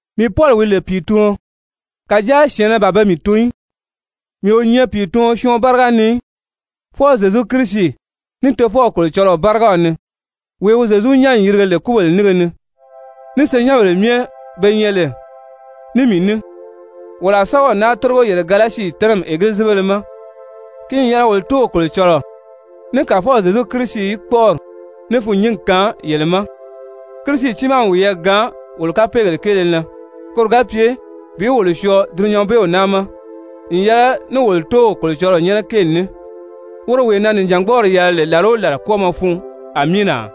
Mii Pɔli wi lè pìituɔn, kàjáa syɛ̀ɛnnɛ ban pe mii tun í, mii o nyɛ pìituɔn syɔɔn báriga ni í, fwɔɔ Zyezu Kirisi, ní Tofɔw Kolocɔlɔɔ bárigaw ni, wee wi Zyezu nyán n yirige lè kúbèle nínge ni, ní senyɛnbèle myɛ be nyɛ lè ní mii ní, wolo a sɛ́bɛw naa tórigo yele Galasi tɛ́nɛmi Egilizibéle ma. Ki n yɛlɛ wolo Tóow Kolocɔlɔɔ ní Kàfɔw Zyezu Kirisi í kpɔ́ʔɔri ní fûnnyingi kaan yele ma. Kirisi tiimaa n wiyɛɛ gaan wolo kapeegèle kéele na koro ga pye bi wolo syɔɔ dulunyanbeew naa ma, n yɛlɛ ní wolo Tóow Kolocɔlɔɔ nyɛ́nɛ kéeli ní, woro wee na nìjangbɔɔri yɛlɛ lè làla o làla kwɔ́ɔmɔ fun! Amiina!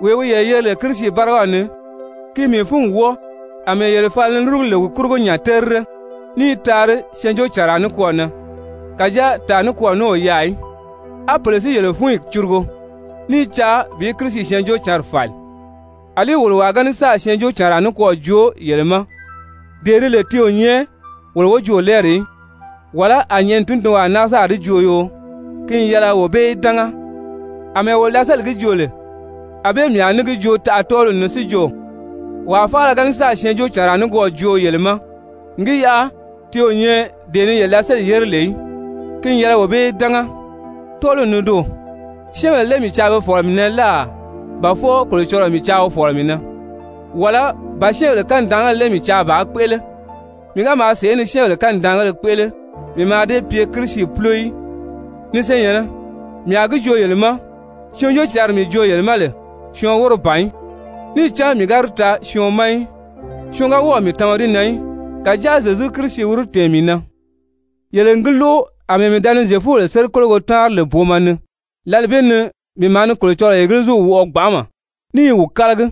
Wee wi yele yeri lè Kirisi bárigaw ni, ki n mii fúngi wɔ́ɔ àmɛɛ yele fala ni lúrugu lè wi kurugo nya terire, ní i taari syɛɛnjóocànraa nikwɔɔ na. Kàjáa tàa nikwɔɔ ní o yaà í, á pèle si i yele fúnyi curugu, ní i caa bi Kirisi Syɛɛnjóocǎnri fàli. Alí wolo wàa ga ní sáà syɛɛnjóocànraa nikwɔɔ joo yele ma dee di lè ti o nyɛ wolo wojoolɛɛri í, wàlá a nyɛ̀ʔɛni tundunwaa náa sáà di joo yoo, ki n yɛlɛ wee bee í dánga. Amɛɛ wolo da sélì gi joo lè, ànbée mii a ní gi joo taʔa tɔ́ɔliw ni, si jo, wàa faala ga ní sáà syɛɛnjóocànraa nikwɔɔ joo yele ma, n gi yaʔa ti o nyɛ dee ni yele da sélì yére lè í, ki n yɛlɛ wee bee í dánga. Tɔ́ɔliw ni doò, syɛ́ɛnbèle lé mii caa be fɔ̀lɔ mii na láà, ba fwɔɔ Kolocɔlɔɔ mii caa wi fɔ̀lɔ mii na? Wàlá ba syɛ́ɛnbèle kanidaangéle lé mii caa bàā kpéʔele? Mii ga maa sèʔé ni syɛ́ɛnbèle kanidaangéle kpéʔele, mii mǎà dée pye Kirisi púlo í. Ni senyɛ̀nnɛ, mii a gi joo yele ma, Syɛɛnjóocǎnri mii joo yele ma lè, syɔɔn wóro ban í, níì cán mii ga di taa syɔɔn ma í, syɔɔn ga wɔ́ɔ̀ mii tama di na í, kàjáa Zyezu Kirisi wi di tɛ̀ɛn mii na. Yele n gi lóʔo àmɛɛ mii da ni Zyefubèle sérikologo táanri lè booma ni, lǎli bee ni mii maa ni Kolocɔlɔɔ Egiliziw wɔʔɔ gbanʔama ní i wi kálagi.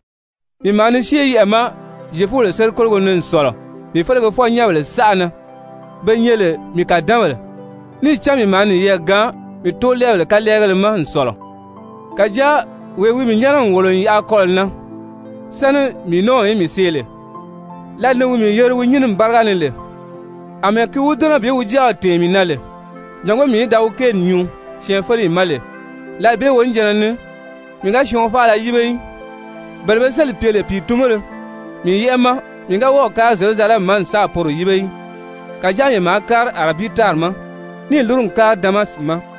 Mii maa ni syée yɛʔɛ̀ ma Zyefubèle sérikologo ni n sɔ̀lɔ mii felegefɔ-nyɛ́nbèle saʔa na, be nyɛ lè mii kàdanbèle, níì cán mii maa niyɛɛ gaan mii tóolɛɛbèle kalɛɛgéle ma n sɔ̀lɔ. Kàjáa wee wi mii nyɛ́nɛ n wòlo n yaʔa kɔlɔ̀ na sáni mii nɔ́ɔw í mii see lè, lǎli ni wi mii yeri wi nyínimi báriga ni lè, àmɛɛ ki wi dɛ́nɛ bi wi Jáaw tɛ̀ɛn mii na lè jàngó mii í da wi kéeli nyuu syɛɛnfeleyi ma lè, lǎli bee wonijanna ni mii ga syɔɔn faala yíbe í. Bele be sélì pye lè pìitunbéle mii yɛ́ʔɛ ma, mii ga wɔ́ɔ̀ kári Zyerusalɛmi ma n sáà poro yíbe í. Kàjáa mii maa kári Arabii tári ma níì lúru n kári Damasi ma.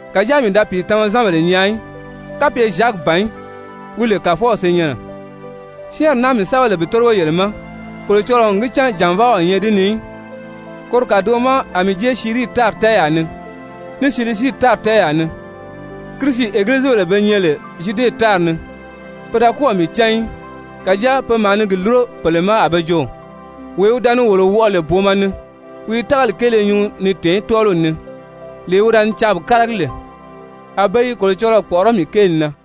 Kàjáa mii da pìitunzanbèle nyaa í kapye Zyaki ban í wi lè Kàfɔw senyɛnnɛ. Syɛ́ɛnri naa mii sɛ́bɛ lè bi tórigo yele ma, Kolocɔlɔɔ n gi cán jànvaa o nyɛ di ni í. Koro kàdoʔo ma a mii jée Sirii tári tɛ́ɛyaa ni, ní Silisii tári tɛ́ɛyaa ní. Kirisi egilizibèle be nyɛ lè Zyude tári ni, pe da kɔ́ɔ̀ mii cán í. Kàjáa pe maa ni gi lúro pèle ma a be jo: «Wee wi da ni wolo wɔʔɔ lè booma ni, wi i tágali kéele nyuu ni téè tɔ́ɔliw ni, lee wi da ni caa bi kálagi lè.» A be i Kolocɔlɔɔ kpɔ̀ʔɔrɔ́ mii kéeli na.